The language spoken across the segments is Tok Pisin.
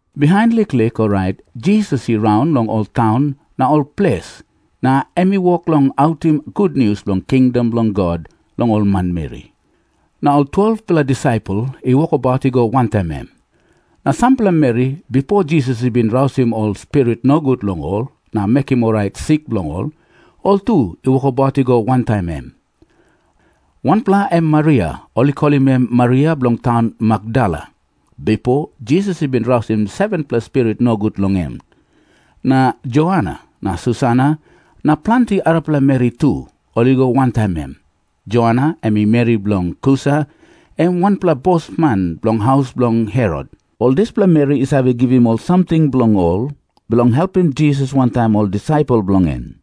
Bihain liklik orait Jisas i raun long ol taun na ol ples na em i wok long autim gutnius bilong kingdom bilong God long ol manmeri. Na ol 12-pela disaipel i wokabaut i go wantaim em. Na sampela meri, bipo Jisas i bin rausim ol spirit nogut long ol na mekim orait sik bilong ol, ol tu i wokabaut i go wantaim em. Wanpela em Maria, ol i kolim em Maria bilong taun Makdala. Bipo Jisas i bin rausim 7-pela spirit nogut long em. Na Joana na Susana na planti arapela meri tu, ol i go wantaim em. Joana em i meri bilong Kusa, em wanpela bosman bilong haus bilong Herot. Ol dispela meri i save givim ol samting bilong ol bilong helpim Jisas wantaim ol disaipel bilong en.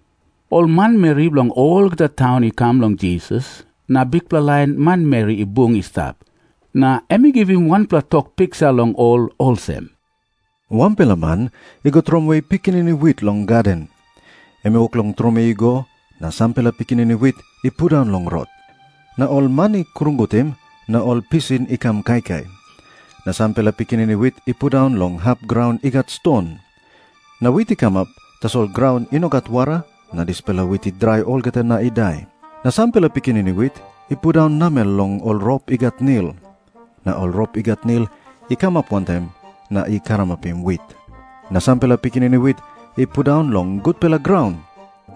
Ol manmeri bilong olgeta taun i kam long Jisas, na bikpela lain manmeri i bung i stap. Na em i givim wanpela tok piksa long ol olsem, “Wanpela man i go tromoi pikinini wit long gaden. Em i wok long tromoi i go, na sampela pikinini wit i pundaun long rot. Na ol man i krungutim, na ol pisin i kam kaikai. Na sampela pikinini wit i pundaun long hap graun i gat ston. Na wit i kamap, tasol graun i no gat wara, na dispela wit i drai olgeta na i dai. Na sampela pikinini wit i pundaun namel long ol rop i gat nil. Na ol rop i gat nil i kamap wantaim na i karamapim wit. Na sampela pikinini wit i pundaun long gutpela graun,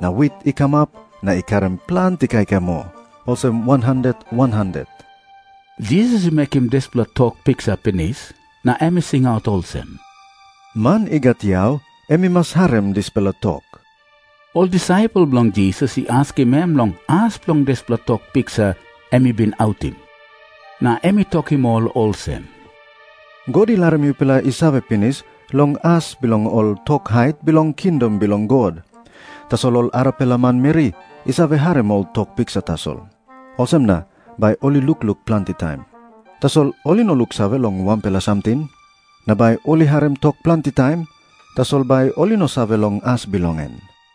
na wit i kamap, na i karim planti kaikai moa, olsem wan wan handet.” Jisas i mekim dispela tok piksa pinis, na em i singaut olsem, “Man i gat yau em i mas harim dispela tok.” Ol disaipel bilong Jisas i askim em long as bilong dispela tok piksa em i bin autim. Na em i tokim ol olsem, “God i larim yupela i save pinis long as bilong ol tok hait bilong kingdom bilong God. Tasol ol arapela manmeri i save harim ol tok piksa tasol. Olsem na bai ol i lukluk planti taim, tasol ol i no luksave long wanpela samting. Na bai ol i harim tok planti taim, tasol bai ol i no save long as bilong en.”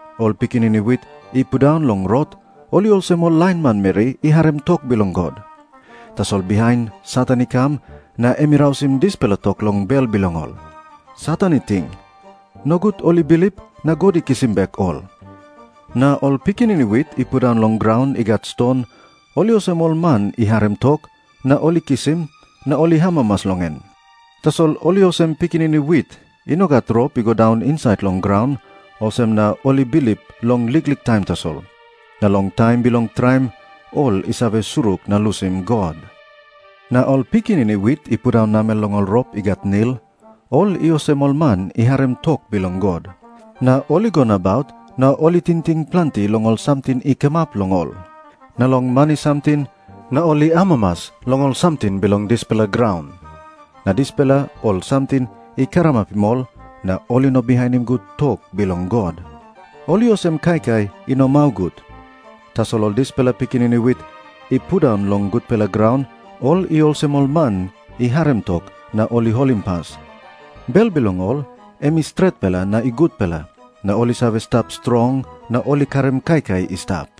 Ol pikinini wit i pundaun long rot, ol i olsem ol lain manmeri i harim tok bilong God, tasol bihain Satan i kam, na em i rausim dispela tok long bel bilong ol. Satan i ting, ‘Nogut ol i bilip, na God i kisim bek ol.’ Na ol pikinini wit i pundaun long graun i gat ston, ol i olsem ol man i harim tok, na ol i kisim, na ol i amamas long en. Tasol ol i olsem pikinini wit i no gat rop i go daun insait long graun, olsem na ol i bilip long liklik taim tasol, na long taim bilong traim, ol i save surik na lusim God. Na ol pikinini wit i pundaun namel long ol rop i gat nil, ol i olsem ol man i harim tok bilong God, na ol i go nabaut na ol i tingting planti long ol samting i kamap long ol na long mani samting na ol i amamas long ol samting bilong dispela graun, na dispela ol samting i karamapim ol na ol i no bihainim gut tok bilong God. Ol i olsem kaikai i no mau gut. Tasol ol dispela pikinini wit i pundaun long gutpela graun, ol i olsem ol man i harim tok na ol i holimpas. Bel bilong ol em i stretpela na i gutpela, na ol i save stap strong na ol i karim kaikai i stap.”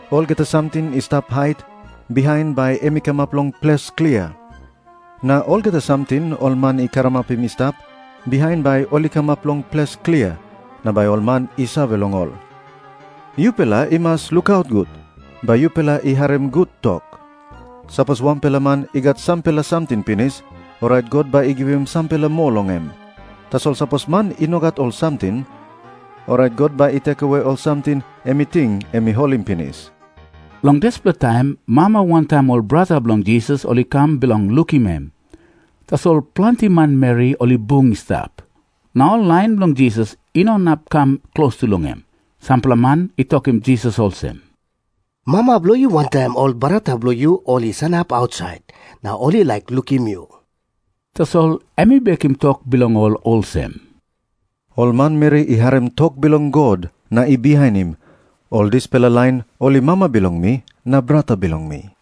Olgeta samting i stap hait, bihain bai em i kamap long ples klia. Na olgeta samting ol man i karamapim i stap, bihain bai ol i kamap long ples klia, na bai ol man i save long ol. “Yupela i mas lukaut gut bai yupela i harim gut tok. Sapos wanpela man i gat sampela samting pinis, orait God bai i givim sampela moa long em. Tasol sapos man i no gat ol samting, orait God bai i rausim ol samting em i ting em i holim pinis.” Long dispela taim mama wantaim ol brata bilong Jisas ol i kam bilong lukim em. Tasol planti manmeri ol i bung i stap, na ol lain bilong Jisas i no inap i kam klostu long em. Sampela man i tokim Jisas olsem, “Mama bilong yu wantaim ol brata bilong yu ol i sanap ausait, na ol i laik lukim yu.” Tasol em i bekim tok bilong ol olsem, “Ol manmeri i harim tok bilong God na i bihainim, ol dispela lain ol i mama bilong mi na brata bilong mi.”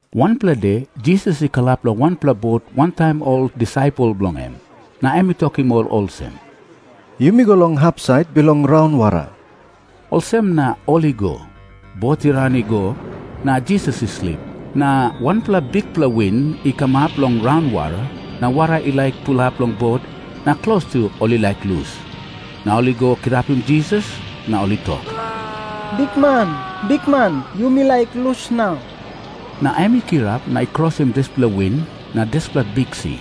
Wanpela de Jisas i kalap long wanpela bot wantaim ol disaipel bilong en. Na em i tokim ol olsem, “Yumi go long hapsait bilong raunwara.” Olsem na ol i go. Bot i ran i go, na Jisas i slip. Na wanpela bikpela win i kamap long raunwara, na wara i laik pulap long bot na klostu ol i laik lus. Na ol i go kirapim Jisas, na ol i tok, “Bikman, bikman, yumi laik lus nau.” Na em i kirap na i krosim dispela win na dispela biksi.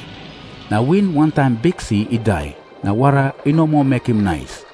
Na win wantaim biksi i dai, na wara i no moa mekim nais.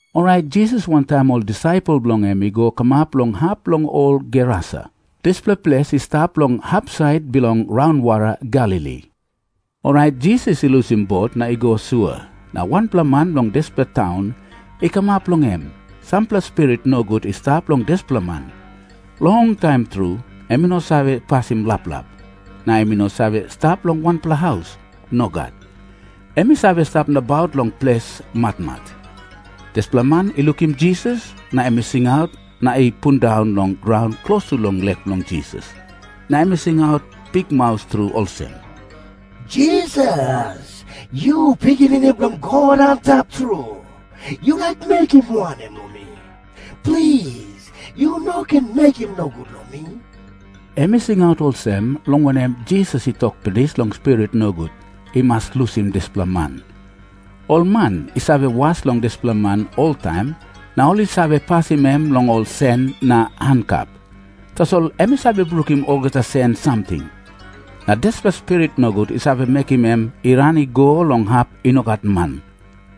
Orait Jisas wantaim ol disaipel bilong en i go kamap long hap bilong ol Gerasa. Dispela ples i stap long hapsait bilong raunwara Galili. Orait Jisas i lusim bot na i go sua, na wanpela man bilong dispela taun i kamap long em. Sampela spirit nogut i stap long dispela man. Longtaim tru em i no save pasim laplap. Na em i no save stap long wanpela haus. Nogat. Em i save stap nabaut long ples matmat. Dispela man i lukim Jisas, na em i singaut na i pundaun long graun klostu long lek bilong Jisas. Na em i singaut bikmaus tru olsem, “Jisas, yu Pikinini bilong God Antap Tru, yu laik mekim wanem long mi? Plis, yu no ken mekim nogut long mi.” Em i singaut olsem, long wanem, Jisas i tok pinis long spirit nogut i mas lusim dispela man. Ol man i save was long dispela man oltaim, na ol i save pasim em long ol sen na hankap. Tasol em i save brukim olgeta sen samting. Na dispela spirit nogut i save mekim em i ran i go long hap i no gat man.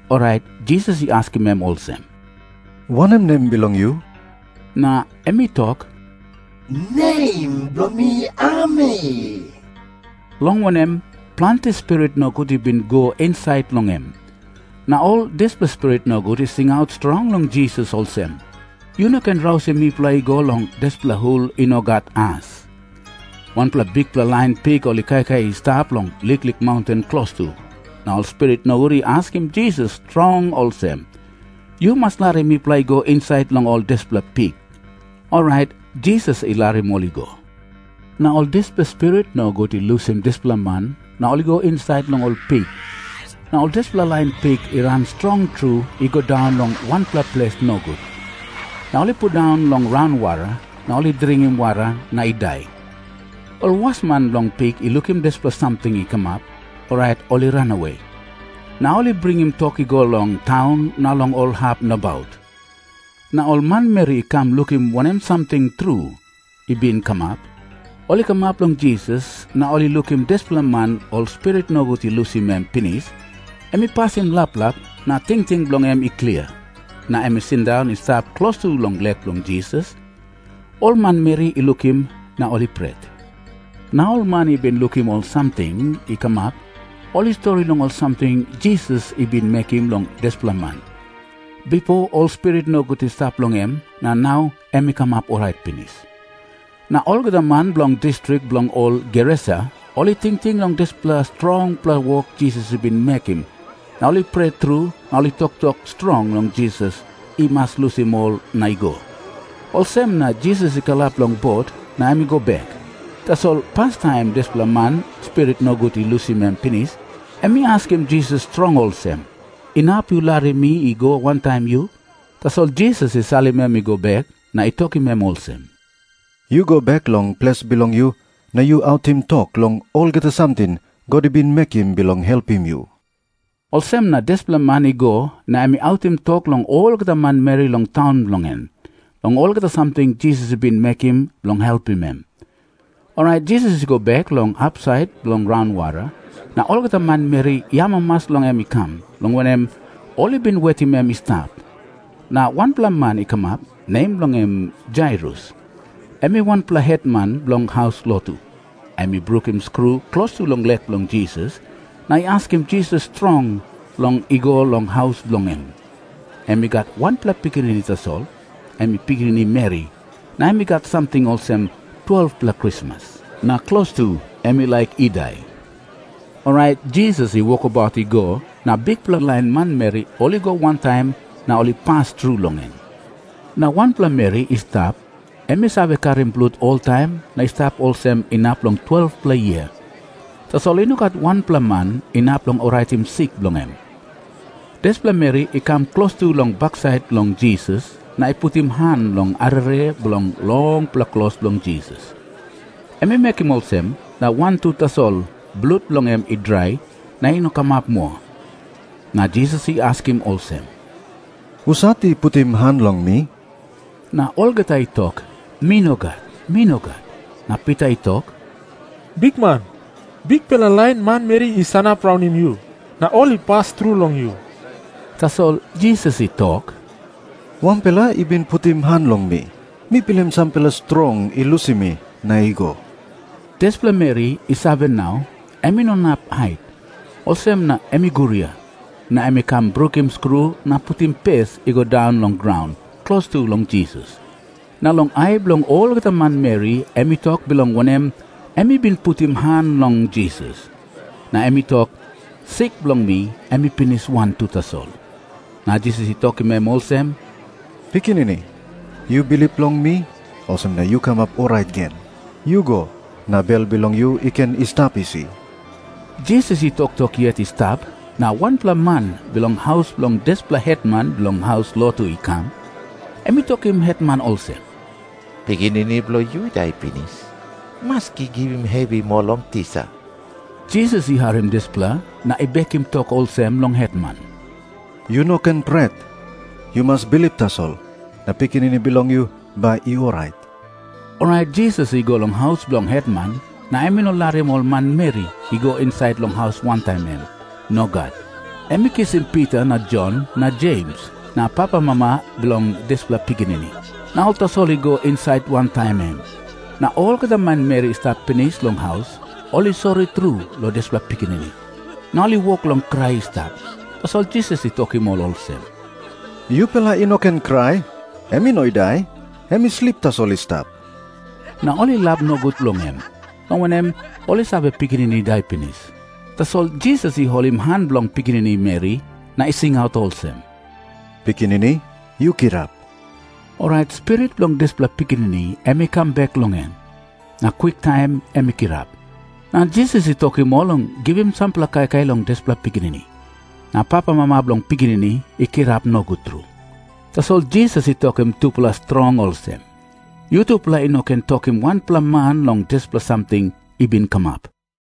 Orait Jisas i askim em olsem, “Wanem nem bilong yu?” Na em i tok, “Nem bilong mi Ami,” long wanem, planti spirit nogut i bin i go insait long em. Na ol dispela spirit nogut i singaut strong long Jisas olsem, “Yu no ken rausim mipela i go long dispela hul i no gat as.” Wanpela bikpela lain pik ol i kaikai i stap long liklik maunten klostu. Na ol spirit nogut i askim Jisas strong olsem, “Yu mas larim mipela i go insait long ol dispela pik.” Orait Jisas i larim ol i go. Na ol dispela spirit nogut i lusim dispela man na ol i go insait long ol pik. Na ol dispela lain pik i ran strong tru i go daun long wanpela ples nogut. Na ol i pundaun long raunwara, na ol i dring wara na i dai. Ol wasman bilong pik i lukim dispela samting i kamap, orait ol i ranawe, na ol bringim tok i go long taun na long ol hap nabaut. Na ol manmeri i kam lukim wanem samting tru i bin kamap. Ol i kamap long Jisas, na ol i lukim dispela man ol spirit nogut i lusim em pinis. Em i pasim laplap, na tingting bilong en i klia, na em i sindaun i stap klostu long lek bilong Jisas. Ol manmeri i lukim, na ol i pret. Na ol man i bin lukim ol samting i kamap, ol i stori long ol samting Jisas i bin mekim long dispela man, bipo ol spirit nogut i stap long en, na nau em i kamap orait pinis. Na olgeta man bilong distrik bilong ol Gerasa, ol i tingting long dispela strongpela wok Jisas i bin mekim na ol i pret tru na ol i tok strong long Jisas i mas lusim ol na i go. Olsem na Jisas i kalap long bot, na em i go bek. Tasol pastaim dispela man ol spirit nogut i lusim em pinis, em i askim Jisas strong olsem, “Inap yu larim mi i go wantaim yu?” Tasol Jisas i salim em i go bek, na i tokim em olsem, “Yu go bek long ples bilong yu, na yu autim tok long olgeta samting God i bin mekim bilong helpim yu.” Olsem na dispela man i go, na em i autim tok long olgeta manmeri long taun bilong en, long olgeta samting Jisas i bin mekim bilong helpim em. Orait Jisas i go bek long hapsait bilong raunwara, na olgeta manmeri i amamas long em i kam, long wanem, ol i bin wetim em i stap. Na wanpela man i kamap, nem bilong en Jairus. Em i wanpela hetman bilong haus lotu. Em i brukim skru klostu long lek bilong Jisas, na i askim Jisas strong long i go long haus bilong en. Em i gat wanpela pikinini tasol, em i pikinini meri, na em i gat samting olsem 12-pela krismas. Na klostu em i laik i dai. Orait Jisas i wokabaut i go, na bikpela lain manmeri ol i go wantaim na ol i pas tru long em. Na wanpela meri i stap, em i save karim blut oltaim na i stap olsem inap long 12-pela yia. Tasol i no gat wanpela man inap long oraitim sik bilong en. Dispela meri i kam klostu long baksait bilong Jisas, na i putim han long arere bilong longpela klos bilong Jisas. Em i mekim olsem, na wantu tasol blut bilong en i drai na i no kamap moa. Na Jisas i askim olsem, “Husat i putim han long mi?” Na olgeta i tok, “Mi nogat. Mi nogat.” Na Pita i tok, “Bikman, bikpela lain manmeri i sanap raunim yu, na ol i pas tru long yu.” Tasol Jisas i tok, “Wanpela i bin putim han long mi. Mi pilim sampela strong i lusim mi na i go.” Dispela meri i save nau, em i no inap hait. Olsem na em i guria, na em i kam brukim skru na putim pes i go daun long graun klostu long Jisas. Na long ai bilong olgeta manmeri em i tok bilong wanem em i bin putim han long Jisas. Na em i tok, “Sik bilong mi em i pinis wantu tasol.” Na Jisas i tokim em olsem, “Pikinini, yu bilip long mi, olsem na yu kamap orait gen. Yu go, na bel bilong yu i ken i stap isi.” Jisas i toktok yet i stap, na wanpela man bilong haus bilong dispela hetman bilong haus lotu i kam. Em i tokim hetman olsem, “Pikinini bilong yu i dai pinis. Maski givim hevi moa long tisa.” Jisas i harim dispela, na i bekim tok olsem long hetman, “Yu no ken pret. Yu mas bilip tasol, na pikinini bilong yu bai i orait.” Orait Jisas i go long haus bilong hetman, na em i no larim ol manmeri i go insait long haus wantaim em. Nogat. Em i kisim Pita na Jon na Jems na papamama bilong dispela pikinini, na ol tasol i go insait wantaim em. Na olgeta manmeri i stap pinis long haus, ol i sori tru long dispela pikinini, na ol i wok long krai i stap. Tasol Jisas i tokim ol olsem, “Yupela i no ken krai. Em i no i dai. Em i slip tasol i stap.” Na ol i lap nogut long em, long wanem, ol i save, pikinini i dai pinis. Tasol Jisas i holim han bilong pikinini meri na i singaut olsem, “Pikinini, yu kirap.” Orait spirit bilong dispela pikinini em i kam bek long em, na kwiktaim em i kirap. Na Jisas i tokim ol long givim sampela kaikai long dispela pikinini. Na papamama bilong pikinini i kirap nogut tru. Tasol Jisas i tokim tupela strong olsem, “Yutupela i no ken tokim wanpela man long dispela samting i bin kamap.”